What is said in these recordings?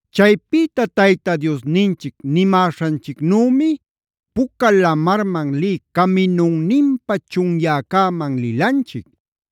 “Chaypïta Tayta Diosninchic nimäśhanchicnümi Puca Lamarman lï caminunninpä chunyäcäman lilanchic.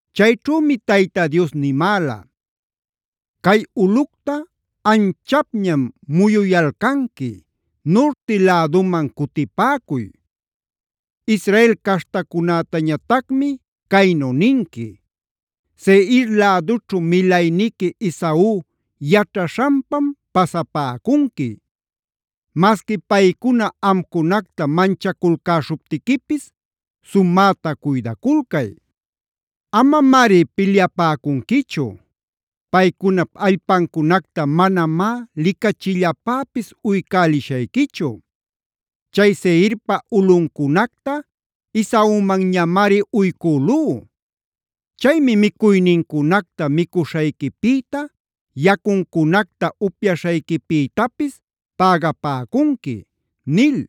Chayćhümi Tayta Dios nimäla: ‘Cay ulꞌucta anchapñam muyuyalcanqui; nurti läduman cutipäcuy. Israel caśhtacunätañatacmi caynu ninqui: “Seirb lädućhu milayniqui Esau yaćhaśhanpam pasapäcunqui. Masqui paycuna amcunacta manchaculcäśhuptiquipis, sumäta cuydaculcay. Amamari pilyapäcunquichu. Paycunap allpancunacta manamá licachillapäpis uycälishayquichu. Chay Seirpa ulꞌuncunacta Esaumanñamari uycülú. Chaymi micuynincunacta micuśhayquipïta, yacuncunacta upyaśhayquipïtapis pägapäcunqui” ’ nil.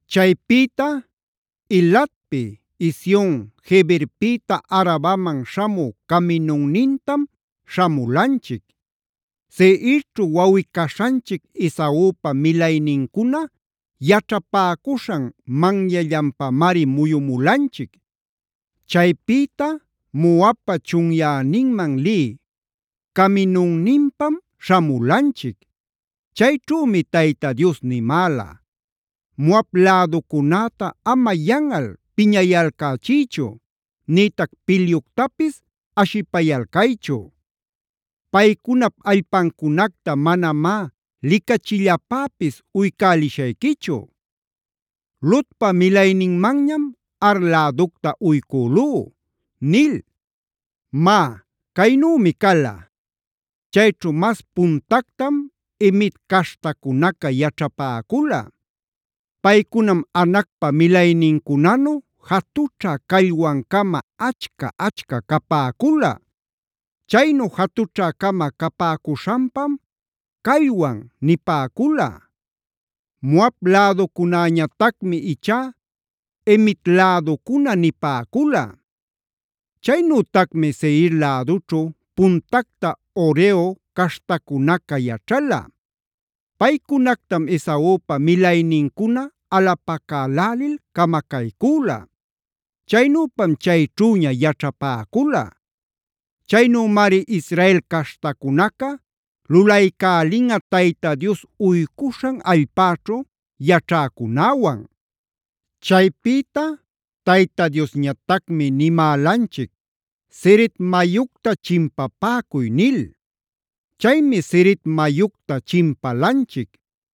“Chaypïta Elatpi Ezion-geberpïta Arabaman śhamü caminunnintam śhamulanchic. Seirćhu wawꞌi-caśhanchic Esaupa milaynincuna yaćhapäcuśhan manyanllanpamari muyumulanchic. Chaypïta Moabpa chunyäninman lï caminunninpam śhamulanchic. Chayćhümi Tayta Dios nimäla: ‘Moab läducunäta ama yanꞌal piñayalcächiychu nïtac pilyuctapis ashipayalcaychu. Paycunap allpancunacta manamá licachillapäpis uycälishayquichu. Lotpac milayninmanñam Ar läducta uycülú’ nil. “Má, caynümi cala: chayćhu mas puntactam Emit caśhtacunaca yaćhapäcula. Paycunam Anacpa milaynincunanu jatućha callwan-cama, achca-achca capäcula. Chaynu jatućhä-cama capäcuśhanpam ‘callwan’ nipäcula. Moab läducunäñatacmi ichá ‘Emit läducuna’ nipäcula. Chaynütacmi Seir lädućhu puntacta Horeo caśhtacunaca yaćhala. Paycunactam Esaupa milaynincuna alapacälälil camacaycüla; chaynüpam chayćhüña yaćhapäcula. Chaynümari Israel caśhtacunaca lulaycälinꞌa Tayta Dios uycuśhan allpäćhu yaćhäcunäwan. “Chaypïta Tayta Diosñatacmi nimälanchic: ‘¡Zeret mayucta chimpapäcuy!’ nil. Chaymi Zered mayucta chimpalanchic.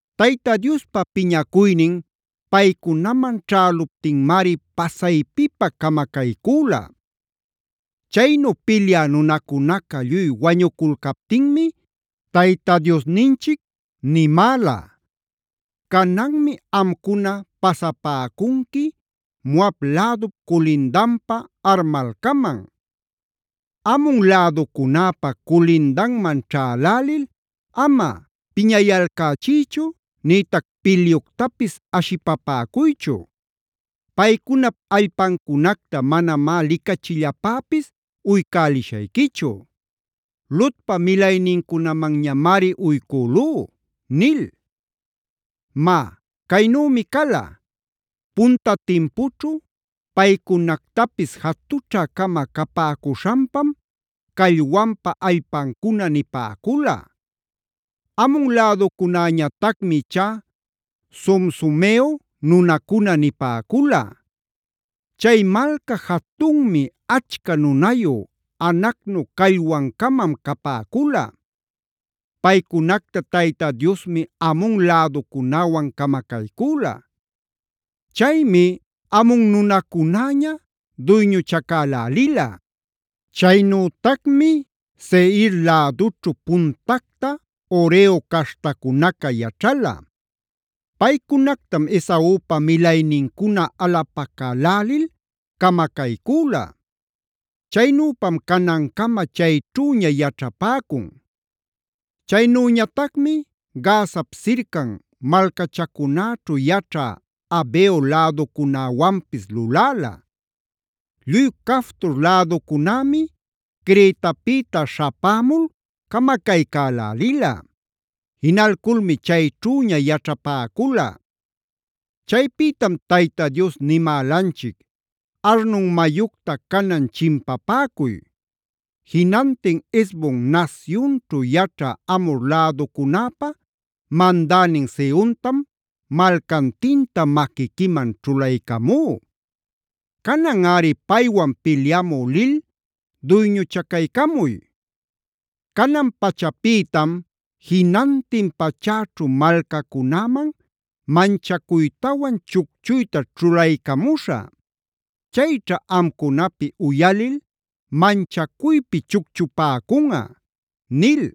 Tayta Diospa piñacuynin paycunaman ćhäluptinmari pasaypipä camacaycüla. “Chaynu pilyä nunacunaca lluy wañuculcaptinmi, Tayta Diosninchic nimäla: ‘Cananmi amcuna pasapäcunqui Moab lädup culindanpa Ar malcaman. Amon läducunäpa culindanman ćhälälil ama piñayalcächiychu nïtac pilyuctapis ashipapäcuychu. Paycunap allpancunacta manamá licachillapäpis uycälishayquichu; Lotpae milaynincunamanñamari uycülú’ nil. “Má caynümi cala: punta timpućhu paycunactapis jatućhä-cama capäcuśhanpam ‘callwanpa allpancuna’ nipäcula. Amon läducunäñatacmi ichá ‘zomzomeo nunacuna’ nipäcula. Chay malca jatunmi, achca nunayu, Anacnu callwan-camam capäcula. Paycunacta Tayta Diosmi Amon läducunäwan camacaycüla. Chaymi Amon nunacunäña duyñuchacälälila. Chaynütacmi Seir lädućhu puntacta Horeo caśhtacunaca yaćhala. Paycunactam Esaupa milaynincuna alapacälälil camacaycüla; chaynüpam canancama chayćhüña yaćhapäcun. Chaynüñatacmi Gazap sircan malcachacunäćhu yaćhä Aveo läducunäwanpis luläla. Lluy Caftor läducunämi Cretapïta śhapämul camacaycälälila. Jinalculmi chayćhüña yaćhapäcula. “Chaypïtam Tayta Dios nimälanchic: ‘¡Arnon mayucta canan chimpapäcuy! Jinantin Hesbon nasyunćhu yaćhä Amhor läducunäpä mandänin Sehontam malcantinta maquiquiman ćhulaycamú. Cananꞌari paywan pilyamü lil duyñuchacaycamuy. Canan pachapïtam jinantin pachäćhu malcacunäman manchacuytawan chucchuyta ćhulaycamuśhä. Chayćha amcunapi uyalil manchacuypi chucchupäcunꞌa’ nil.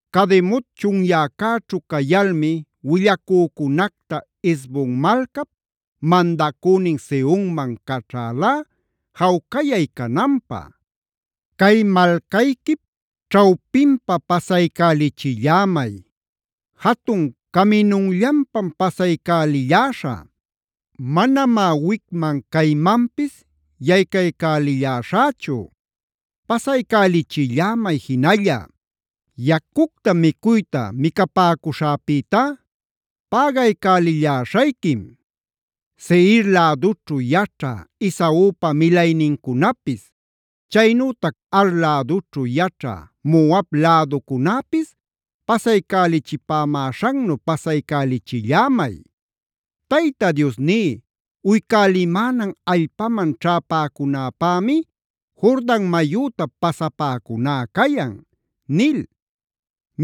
“Cademot chunyäcäćhu cayalmi willacücunacta Hesbon malcap mandacünin Sehonman caćhalá jawcayay cananpä: ‘Cay malcayquip ćhawpinpa pasaycälichillämay. Jatun caminunllanpam pasaycälilläśhä. Manamá wicman caymanpis yaycaycälilläśhächu. Pasaycälichillämay jinalla; yacucta micuyta micapäcuśhäpïtá pägaycälilläśhayquim. Seir lädućhu yaćhä Esaupa milaynincunapis, chaynütac Ar lädućhu yaćhä Moab läducunäpis pasaycälichipämäśhannu pasaycälichillämay. Tayta Diosní uycälimänan allpaman ćhäpäcunäpämi Jordan mayüta pasapäcuná cayan’ nil.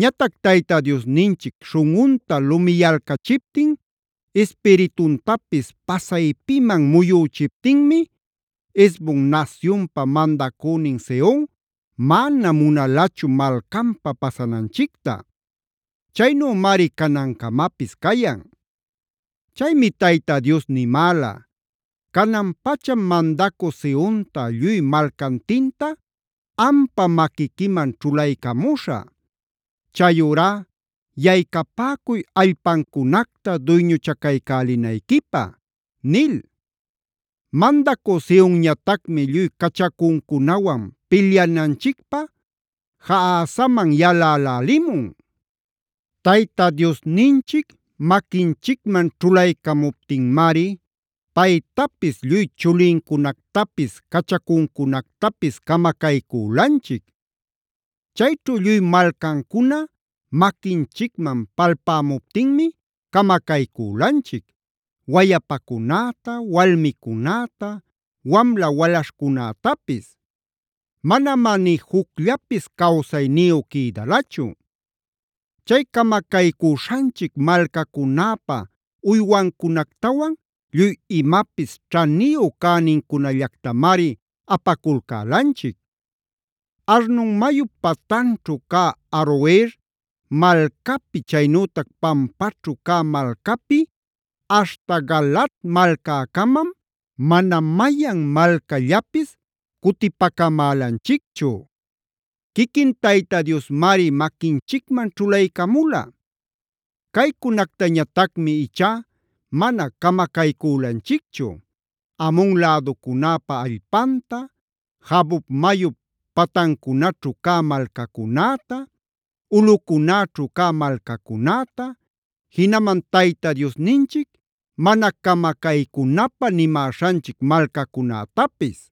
“Ñatac Tayta Diosninchic śhunꞌunta lumiyalcachiptin ispirituntapis pasaypiman muyüchiptinmi Hesbon nasyunpa mandacünin Sehon mana munalachu malcanpa pasananchicta. Chaynümari canancamapis cayan. “Chaymi Tayta Dios nimäla: ‘Canan-pacham mandacü Sehonta lluy malcantinta ampa maquiquiman ćhulaycamuśhä. Chayurá yaycapäcuy allpancunacta duyñuchacaycälinayquipä’ nil. “Mandacü Sehonñatacmi lluy cachacuncunawan pilyananchicpä Jahazaman yalälälimun. Tayta Diosninchic maquinchicman ćhulaycamuptinmari paytapis, lluy chulincunactapis, cachacuncunactapis camacaycülanchic. Chayćhu lluy malcancuna maquinchicman palpämuptinmi camacaycülanchic: Wayapacunäta, walmicunäta, wamla walaśhcunätapis. Manamá ni jucllapis cawsayniyu quïdalachu. Chay camacaycüśhanchic malcacunäpä uywancunactawan lluy imapis ćhaniyu cänincunallactamari apaculcälanchic. Arnon mayup patanćhu cä Aroer malcapi, chaynütac pampaćhu cä malcapi aśhta Galaad malcäcämam mana mayan malcallapis cutipacamälanchicchu. Quiquin Tayta Diosmari maquinchicman ćhulaycamula. Caycunactañatacmi ichá mana camacaycülanchicchu: Amon läducunäpä allpanta, Jaboc mayup patancunaćhu cä malcacunäta, ulꞌucunäćhu cä malcacunäta, jinaman Tayta Diosninchic mana camacaycunapä nimäśhanchic malcacunätapis.